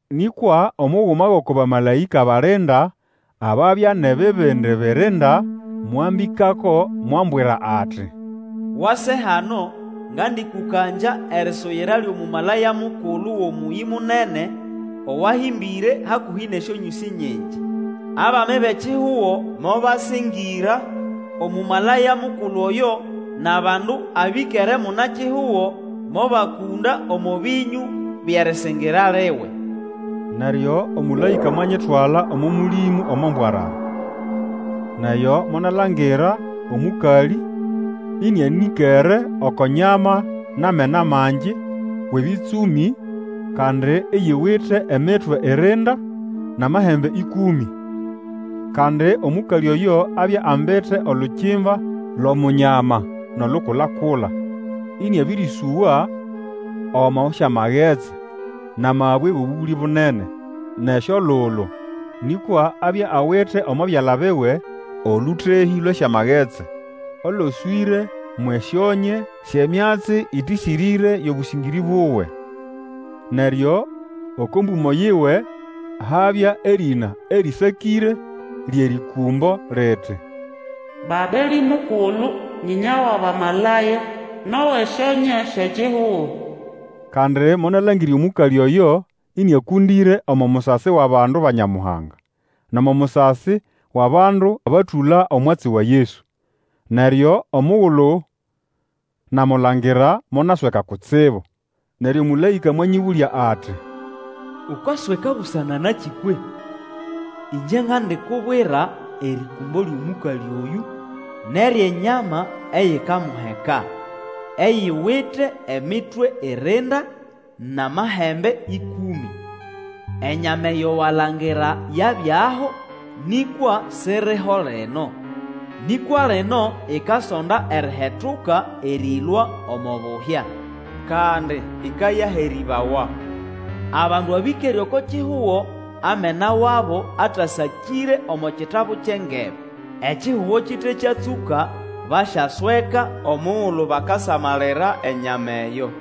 Nĩkwa omuguma wʼoko bamalaĩka balinda ababya nʼebibindi birinda mwambĩkako mwambwira ati, Wase hano, ngandĩkũkangya erisuyira lyʼomũmalaya mukulu gʼomũyĩ munene owahĩmbĩre hakũhĩ nʼesyonyũsĩ nyingi. Abami bʼekihugo mobasĩngĩra Omũmalaya mukulu oyo, nʼabandu abĩkere munakihugo mobakũnda omo bĩnyũ byʼerĩsĩngĩra liwe. Neryo omũlaĩka mwanyitwala omo Mũlĩmũ omo mbwarara. Nʼeyo monalangira omũkalĩ ĩnĩanĩkere oko nyama nʼamena mangi wʼebĩtsũmĩ, kandi iyiwite emitwe irinda, nʼamahembe ĩkũmĩ. Kandi omũkalĩ oyo abya ambite olukimba lʼomunyama nʼolukula-kula, inĩabĩrĩsũwa omo syamagetsi, nʼamabwe wʼobũgũlĩ bunene, nʼesyolulu. Nĩkwa abya awite omo byala biwe olũtehĩ lwʼesyamagetsi oloswĩre mwʼesyonye syʼemyatsi ĩtĩsĩrĩre yʼobũsĩngĩrĩ buwe. Neryo oko mbũmo yiwe habya erĩna erĩsakĩre lyʼerĩkũmbo liti, Babelĩ Mukulu, nyĩnya wʼabamalaya, nʼowʼesyonye syʼekihugo. Kandi monalangira omũkalĩ oyo, ĩnĩakũndĩre omo musasi wʼabandu ba Nyamuhanga, nʼomo musasi wʼabandu batũla omwatsi wa Yesu. Neryo omugulu namulangira monasweka kutsibu. Neryo omũlaĩka mwanyĩbũlya ati, Ukasweka busana nakĩ kwehĩ? Ĩngye ngandikubwira erĩkũmbo lyʼomũkalĩ oyũ nʼeryʼenyama eyikamuheka, eyiwite emitwe irinda nʼamahembe ĩkũmĩ. Enyama eyo walangira yabyaho, nĩkwa siriho lino, nĩkwa lino ikasonda erihetuka erĩlũa omo buhya, kandi ĩkayaherĩbawa. Abandu abĩkere oko kihugo amena wabo atasakĩre omo kitabu kyʼengebe, ekihugo kite kyatsũka, basyasweka omugulu bakasamalira enyama eyo.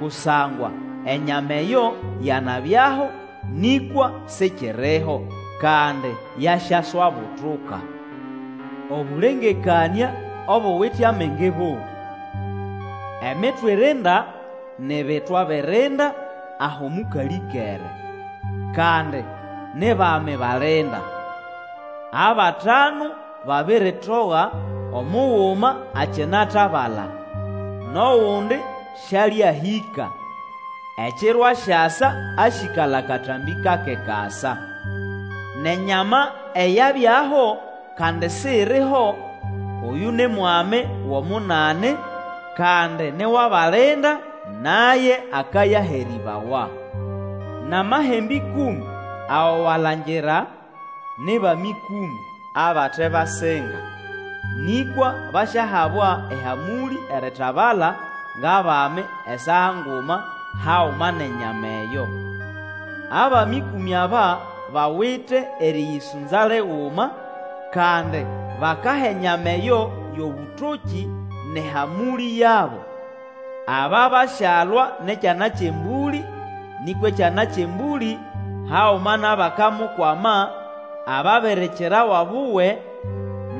Kusangwa enyama eyo yanabyaho, nĩkwa sikiriho, kandi yasyaswabutuka. Obũlengekanĩa obuwite amenge bobũ. Emitwe irinda ni bitwa birinda aho mũkalĩ ĩkere. Kandi ni bami balinda. Abatanu babiritoga, omuguma akinatabala, nʼogundi sĩalĩahĩka; ekiro asyasa asyĩkala katambĩ kake kasa. Nʼenyama eyabyaho, kandi siriho, oyũ ni mwami wʼomunani, kandi ni wʼabalinda, naye akayaherĩbawa. Nʼamahembe ĩkũmĩ ago walangira, ni bami ĩkũmĩ, abate basinga, nĩkwa basyahabwa ehamũlĩ eritabala ngʼabami esaa nguma haguma nʼenyama eyo. Abami ĩkũmĩ aba bawite erĩyĩsũnza liguma, kandi bakaha enyama eyo yʼobũtokĩ nʼehamũlĩ yabo. Aba basyalwa nʼEkyana kyʼEmbũlĩ, nĩkwa Ekyana kyʼEmbũlĩ, haguma nʼabakamukwama, ababirikirawa buwe,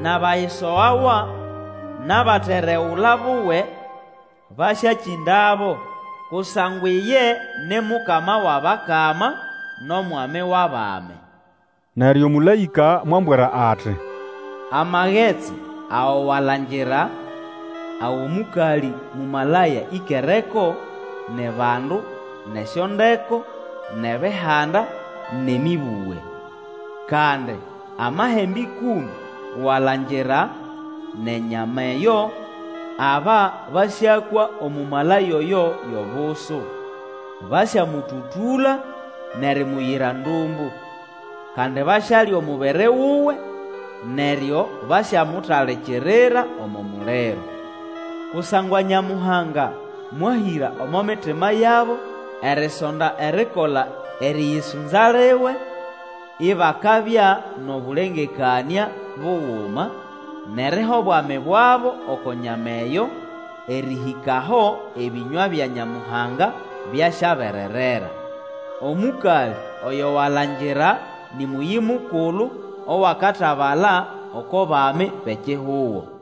nʼabayisogawa, nʼabateregula buwe, basyakĩndabo, kusangwa iye ni Mukama wʼabakama, nʼOmwami wʼabami. Neryo omũlaĩka mwambwira ati, Amagetsi ago walangira, ago mũkalĩ mũmalaya ĩkereko, ni bandu, nʼesyondeko, nʼebihanda, nʼemĩbũge. Kandi amahembe ĩkũmĩ walangira, nʼenyama eyo, aba basyakwa Omũmalaya oyo yʼobusu. Basyamũtũtũla, nʼerimuyira ndũmbũ. Kandi basyalya omubiri wuwe, neryo basyamutalikirira omo muliro. Kusangwa Nyamuhanga mwahĩra omo mitima yabo erisonda erikola erĩyĩsũnza liwe, ibakabya nʼobũlengekanĩa buguma, nʼeriha obwami bwabo oko nyama eyo, erĩhĩka aho ebĩnywa bya Nyamuhanga byasyabererera. Omũkalĩ oyo walangira nĩ mũyĩ mukulu owakatabala oko bami bʼekihugo.